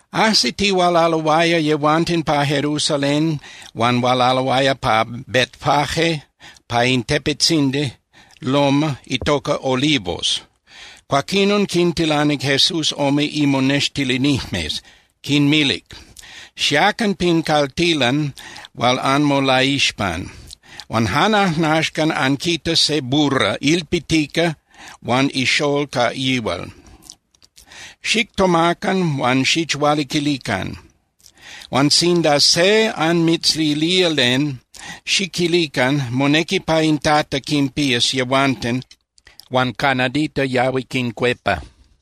Ajsitihualaloaya yehuanten pa Jerusalén huan hualaloaya pa Betfagé pa in tepetzindi (loma) itoca Olivos. Cuaquinon quintilanic Jesús ome imonextilinijmes. Quinmilic: —Xiacan pin caltilan hual anmolaixpan, huan jan ajnaxcan anquitas se burra ilpitica huan ixól ca yihual. Xictomacan huan xichhualiquilican. Huan sinda se anmitzilía len, xiquilican: “Monequi pa in Tata quinpías yehuanten huan ca nadita yahui quincuepa.”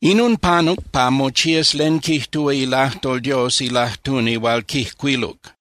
Inon panuc pa mochías len quijtúa ilajtol Dios ilajtuni hual quijcuiluc: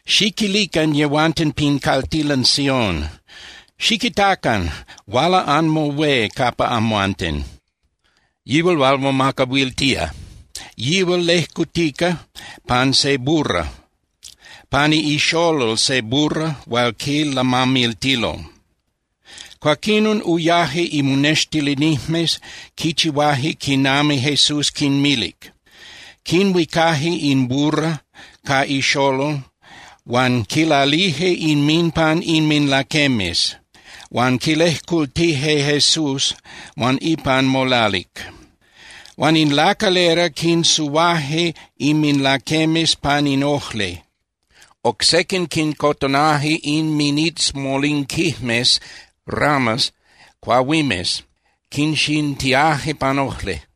Xiquilican yehuanten pin caltilan Sión: “Xiquitacan, huala anmoHué capa amhuanten, yihual hual momacahuiltía, yihual lejcutica pan se burra, pani ixolol se burra hual quilamamiltilo.” Cuaquinon uyaje imonextilinijmes, quichihuaje quinami Jesús quinmilic. Quinhuicaje in burra ca ixolol, huan quilalije inminpan inminlaquemes, huan quilejcultije Jesús huan ipan molalic. Huan in lacalera quinsuhuaje inminlaquemes pan in ojli. Oc sequin quincotonaje inminitzmolinquijmes (ramas) cuahuimes, quinxintiaje pan ojli.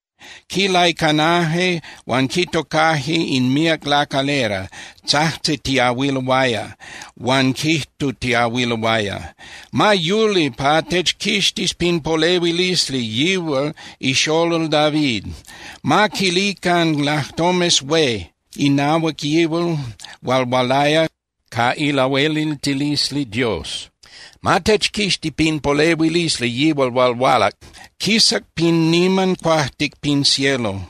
Quilaicanaje huan quitocaje in míac lacalera tzajtzitiahuiloaya huan quijtutiahuiloaya: —¡Ma yuli pa techquixtis pin polehuilisli yihual ixolol David! ¡Ma quilican lajtomes hué inahuac yihual hual hualaya ca ilahueliltilisli Dios! ¡Ma techquixti pin polehuilisli yihual hual hualac, quisac pin niman cuajtic pin cielo!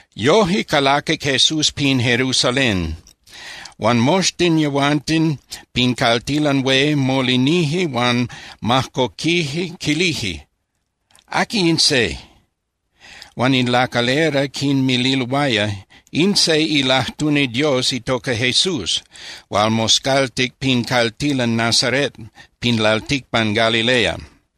Yoje calaquic Jesús pin Jerusalén, huan moxtin yehuanten pin caltilan hué molinije huan majcoquije, quilije: —¿Aqui in se? Huan in lacalera quinmililoaya: —In se ilajtuni Dios itoca Jesús hual moscaltic pin caltilan Nazaret pin lalticpan Galilea.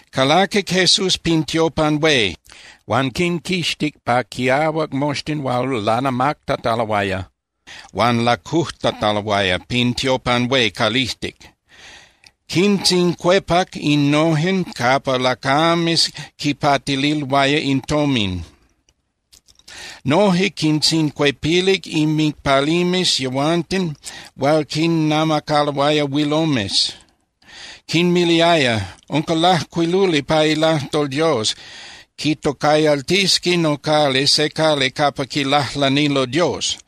Calaquic Jesús pin tiopan hué huan quinquixtic pa quiahuac moxtin hual lanamactataloaya huan lacujtataloaya pin tiopan hué calijtic. Quintzincuepac innojen capa lacames quipatililoaya in tomin. Noje quintzincuepilic inmicpalimes yehuanten hual quinnamacaloaya huilomes. Quinmiliaya: —Unca lajcuiluli pa ilajtol Dios: “Quitocayaltisqui nocali se cali capa quilajlanilo Dios.”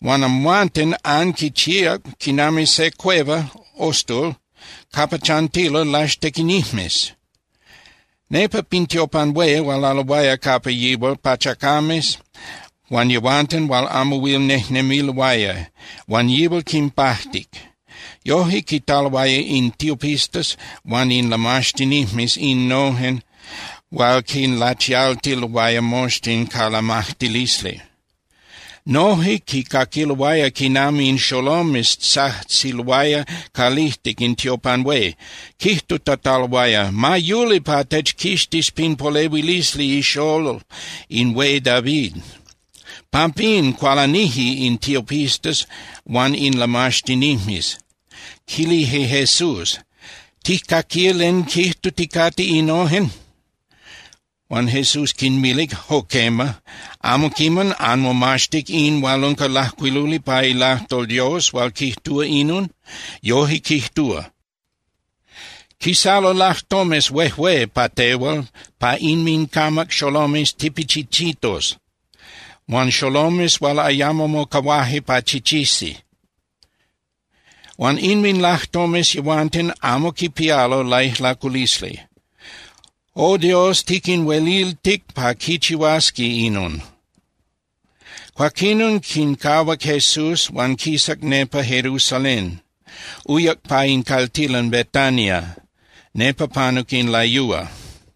Huan amhuanten anquichihuac quinami se cueva (ostul) capa chantilo laxtequinijmes. Nepa pin tiopan hué hualaloaya capa yihual pachacames huan yehuanten hual amo huil nejnemiloaya, huan yihual quinpajtic. Yoje quitaloaya in tiopistas huan in lamaxtinijmes innojen hual quinlachialtiloaya moxtin ca lamajtilisli. Noje quicaquiloaya quinami in xolomes tzajtziloaya calijtic in tiopan hué, quijtutataloaya: “¡Ma yuli pa techquixtis pin polehuilisli ixól in Hué David!” Pampín cualanije in tiopistas huan in lamaxtinijmes. Quilije Jesús: —¿Tijcaquía len quijtuticate innojen? Huan Jesús quinmilic: —Jo quema. ¿Amo quiman anmomaxtic in hual unca lajcuiluli pa ilajtol Dios hual quijtúa inon? Yoje quijtúa: Quisalo lajtomes huejué pa tehual pa inmincamac xolomes tipichinchitos huan xolomes hual ayamo mocahuajque pa chichisi. Huan inminlajtomes yehuanten amo quipialo laijlaculisli. O Dios, tiquinhueliltic pa quichihuasqui inon. Cuaquinon quincahuac Jesús huan quisac nepa Jerusalén, uyac pa in caltilan Betania, nepa panuc in layúa.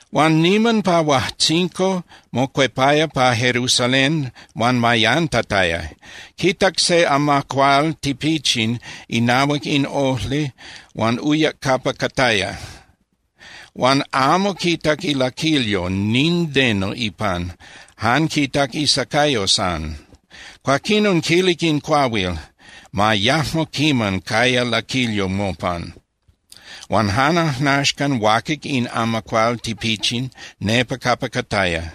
Huan niman pa huajtzinco, mocuepaya pa Jerusalén huan mayantataya. Quitac se amacual tipichin inahuac in ojli huan uyac capa cataya. Huan amo quitac ilaquilyo nindeno ipan, jan quitac isacayo san. Cuaquinon quilic in cuahuil: —Ma yajmo quiman caya laquilyo mopan. Huan jan ajnaxcan huaquic in amacual tipichin nepa capa cataya.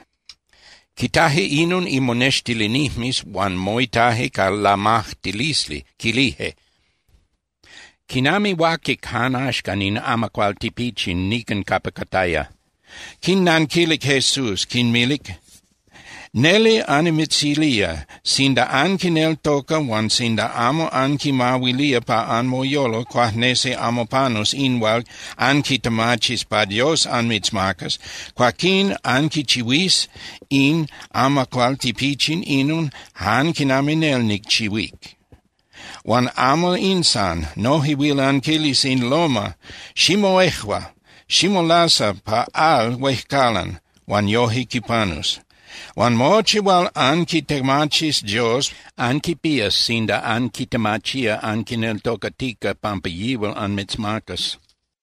Quitaje inon imonextilinijmes huan moitaje ca lamajtilisli, quilije: —¿Quinami huaquic jan axcan in amacual tipichin nican capa cataya? Quinnanquilic Jesús, quinmilic: —Neli annimitzilía, sinda anquineltoca huan sinda amo anquimahuilía pa anmoyolo cuajnesi amo panus in hual anquitemachis pa Dios anmitzmacas, cuaquín anquichihuís in amacual tipichin inon jan quinami nel nicchihuíc. Huan amo in san. Noje huil anquilis in loma: “Ximoejua, ximolasa pa al huejcalan”, huan yoje quipanus. Huan mochi hual anquitemachis Dios anquipías sinda anquitemachía anquineltocatica pampa yihual anmitzmacas.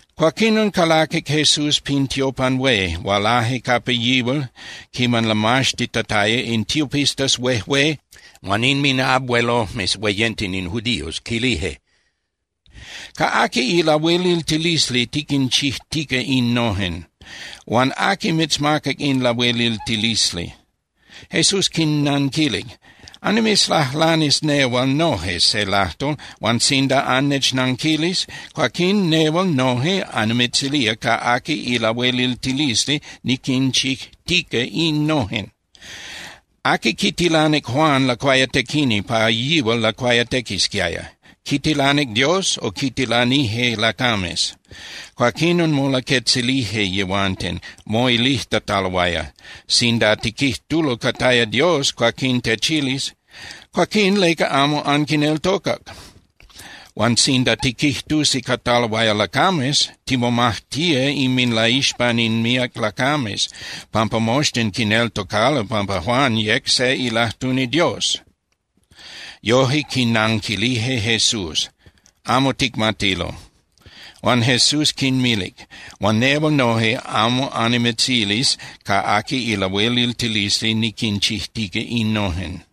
Cuaquinon calaquic Jesús pin tiopan hué, hualaje capa yihual quiman lamaxtitataya in tiopistas huejué huan inminabuelojmes hueyenten in judíos, quilije: —¿Ca aqui ilahueliltilisli tiquinchijtica innojen? Huan ¿aqui mitzmacac in lahueliltilisli? Jesús quinnanquilic: —Annimitzlajlanis nehual noje se lajtol, huan sinda annechnanquilis, cuaquín nehual noje annimitzilía ca aqui ilahueliltilisli niquinchijtica innojen. ¿Aqui quitilanic Juan Lacuayatequini pa yihual lacuayatequisquiaya? ¿Quitilanic Dios, o quitilanije lacames? Cuaquinon molaquetzilije yehuanten, moilijtataloaya: —Sinda tiquijtulo cataya Dios, cuaquín techilis: “Cuaquín ¿leca amo anquineltocac?” Huan sinda tiquijtusi cataloaya lacames, timomajtía inminlaixpan in míac lacames, pampa moxtin quineltocalo pampa Juan yec se ilajtuni Dios. Yoje quinanquilije Jesús: —Amo ticmatilo. Huan Jesús quinmilic: —Huan nehual noje amo annimitzilis ca aqui ilahueliltilisli niquinchijtica innojen.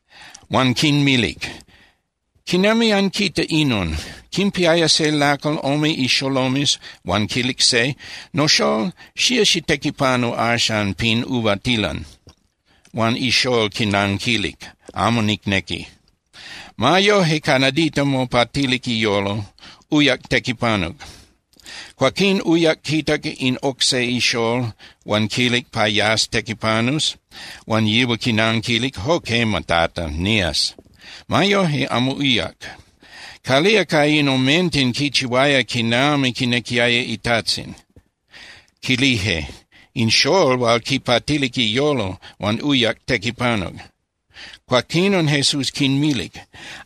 Huan quinmilic: —¿Quinami anquita inon? Quimpiaya se lacal ome ixolomes huan quilic se: “Noxól, xía xitequipanu axan pin uvatilan.” Huan ixól quinanquilic: “Amo nicnequi.” Ma yoje, ca nadita mopatilic iyolo, uyac tequipanuc. Cuaquín uyac quitac in oc se ixól huan quilic pa yas tequipanus, huan yihual quinanquilic: “Jo quema, Tata, nías.” Ma yoje, amo uyac. ¿Calía ca in omenten quichihuaya quinami quinequiaya itajtzin? Quilije: —In xól hual quipatilic iyolo huan uyac tequipanuc. Cuaquinon Jesús quinmilic: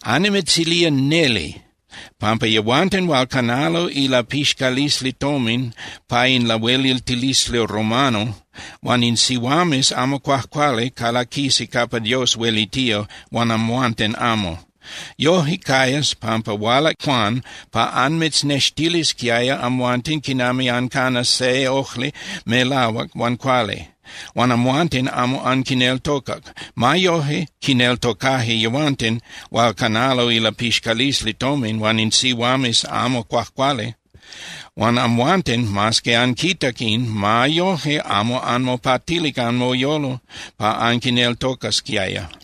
—Annimitzilía neli pampa yehuanten hual canalo ilapixcalisli tomin pa in lahueliltilisli romano, huan in sihuames amo cuajcuali calaquisi capa Dios huelitía huan amhuanten amo. Yoje cayas, pampa hualac Juan pa anmitznextilisquiaya amhuanten quinami ancanas se ojli melahuac huan cuali. Huan amhuanten amo anquineltocac. Ma yoje, quineltocaje yehuanten hual canalo ilapixcalisli tomin huan in sihuames amo cuajcuali. Huan amhuanten, mas que anquitac in, ma yoje amo anmopatilic anmoyolo pa anquineltocasquiaya.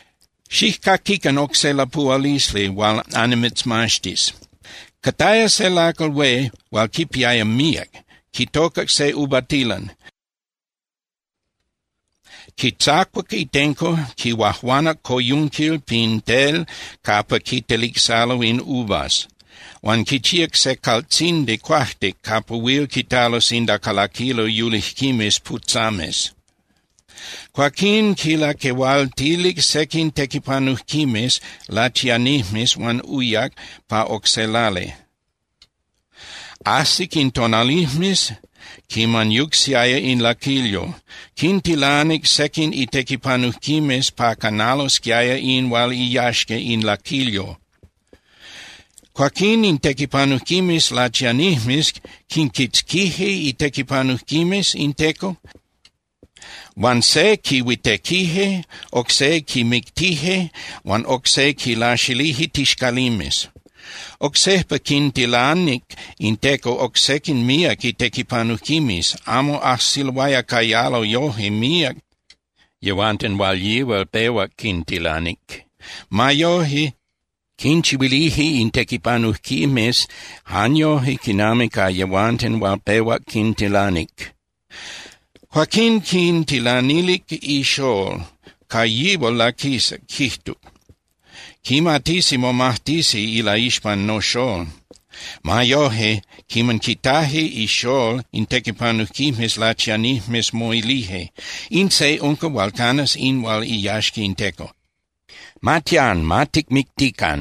Xijcaquican oc se lapuhualisli hual annimitzmaxtis. Cataya se lacal hué hual quipiaya míac, quitocac se uvatilan. Quitzacuac itenco, quihuajuanac coyunquil pin tel capa quitelicsalo in uvas, huan quichíac se caltzindi cuajtic capa huil quitalo sinda calaquilo yulijquimes putzames. Cuaquín quilaquehualtilic sequin tequipanujquimes lachianijmes huan uyac pa oc se lali. Ajsic in tonalijmes quiman yucsiaya in laquilyo. Quintilanic sequin itequipanujquimes pa canalosquiaya in hual iyaxca in laquilyo. Cuaquín in tequipanujquimes lachianijmes quinquitzquije itequipanujquimes in teco, huan se quihuitequije, oc se quimictije huan oc se quilaxilije tixcalimes. Oc sejpa quintilanic in teco oc sequin míac itequipanujquimes, amo ajsiloaya cayalo yoje míac yehuanten hual yihual pehuac quintilanic. Ma yoje, quinchihuilije in tequipanujquimes jan yoje quinami ca yehuanten hual pehuac quintilanic. Cuaquín quintilanilic ixól, ca yihual laquisac, quijtuc: “Quimatisi momajtisi ilaixpan noxól.” Ma yoje, quiman quitaje ixól in tequipanujquimes lachianijmes, moilije: “In se unca hual canas in hual iyaxca in teco. Ma tián, ma ticmictican.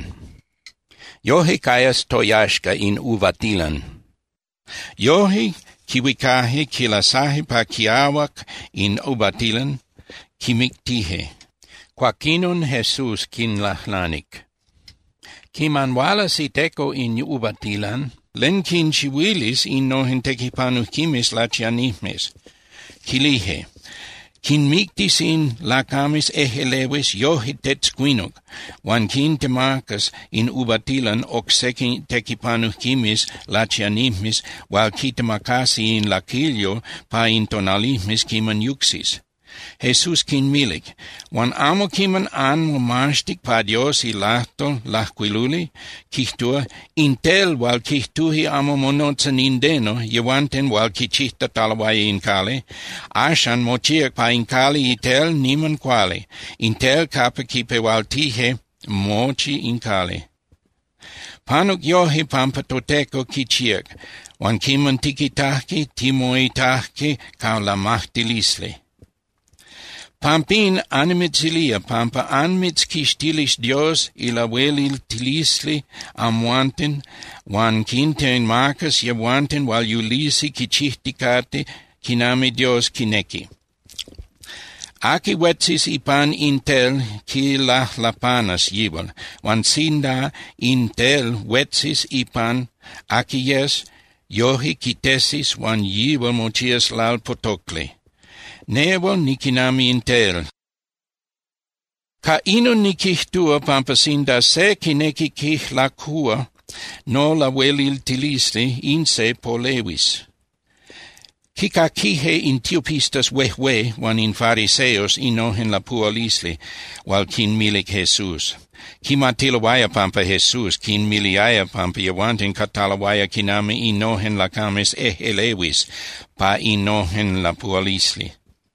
Yoje cayas toyaxca in uvatilan.” Yoje quihuicaje, quilasaje pa quiahuac in uvatilan, quimictije. Cuaquinon Jesús quinlajlanic: —Quiman hualas iteco in uvatilan, ¿len quinchihuilis innojen tequipanujquimes lachianijmes? Quilije: —Quinmictis in lacames ejꞌelehuis yoje tetzcuinuc huan quintemacas in uvatilan oc sequin tequipanujquimes lachianijmes hual quitemacasi in laquilyo pa in tonalijmes quiman yucsis. Jesús quinmilic: —Huan ¿amo quiman anmomaxtic pa Dios ilajtol lajcuiluli? Quijtúa: In tel hual quijtuje amo monotza nindeno yehuanten hual quichijtataloaya in cali, axan mochíac pa in cali itel niman cuali, in tel capa quipehualtijque mochi in cali. Panuc yoje pampa toTeco quichíac, huan quiman tiquitajque, timoitajque ca lamajtilisli. Pampín, annimitzilía pampa anmitzquixtilis Dios ilahueliltilisli amhuanten huan quintemacas yehuanten hual yulisi quichijticate quinami Dios quinequi. Aqui huetzis ipan in tel quilajlapanas yihual. Huan sinda in tel huetzis ipan aqui yes, yoje quitesis huan yihual mochías lalpotocli. Nehual niquinami in tel. Ca inon niquijtúa pampa sinda se quinequi quijlacúa nolahueliltilisli, in se polehuis. Quicaquije in tiopistas huejué huan in fariseos innojen lapuhualisli hual quinmilic Jesús. Quimatiloaya pampa Jesús quinmiliaya pampa yehuanten cataloaya quinami innojen lacames ejꞌelehuis pa innojen lapuhualisli.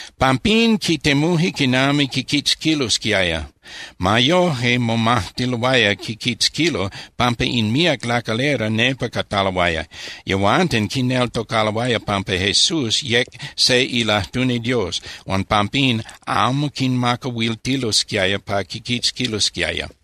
Pampín quitemuje quinami quiquitzquilosquiaya. Ma yoje, momajtiloaya quiquitzquilo pampa in míac lacalera nepa cataloaya. yehuanten quineltocaloaya pampa Jesús yec se ilajtuni Dios, huan pampín amo quinmacahuiltilosquiaya pa quiquitzquilosquiaya.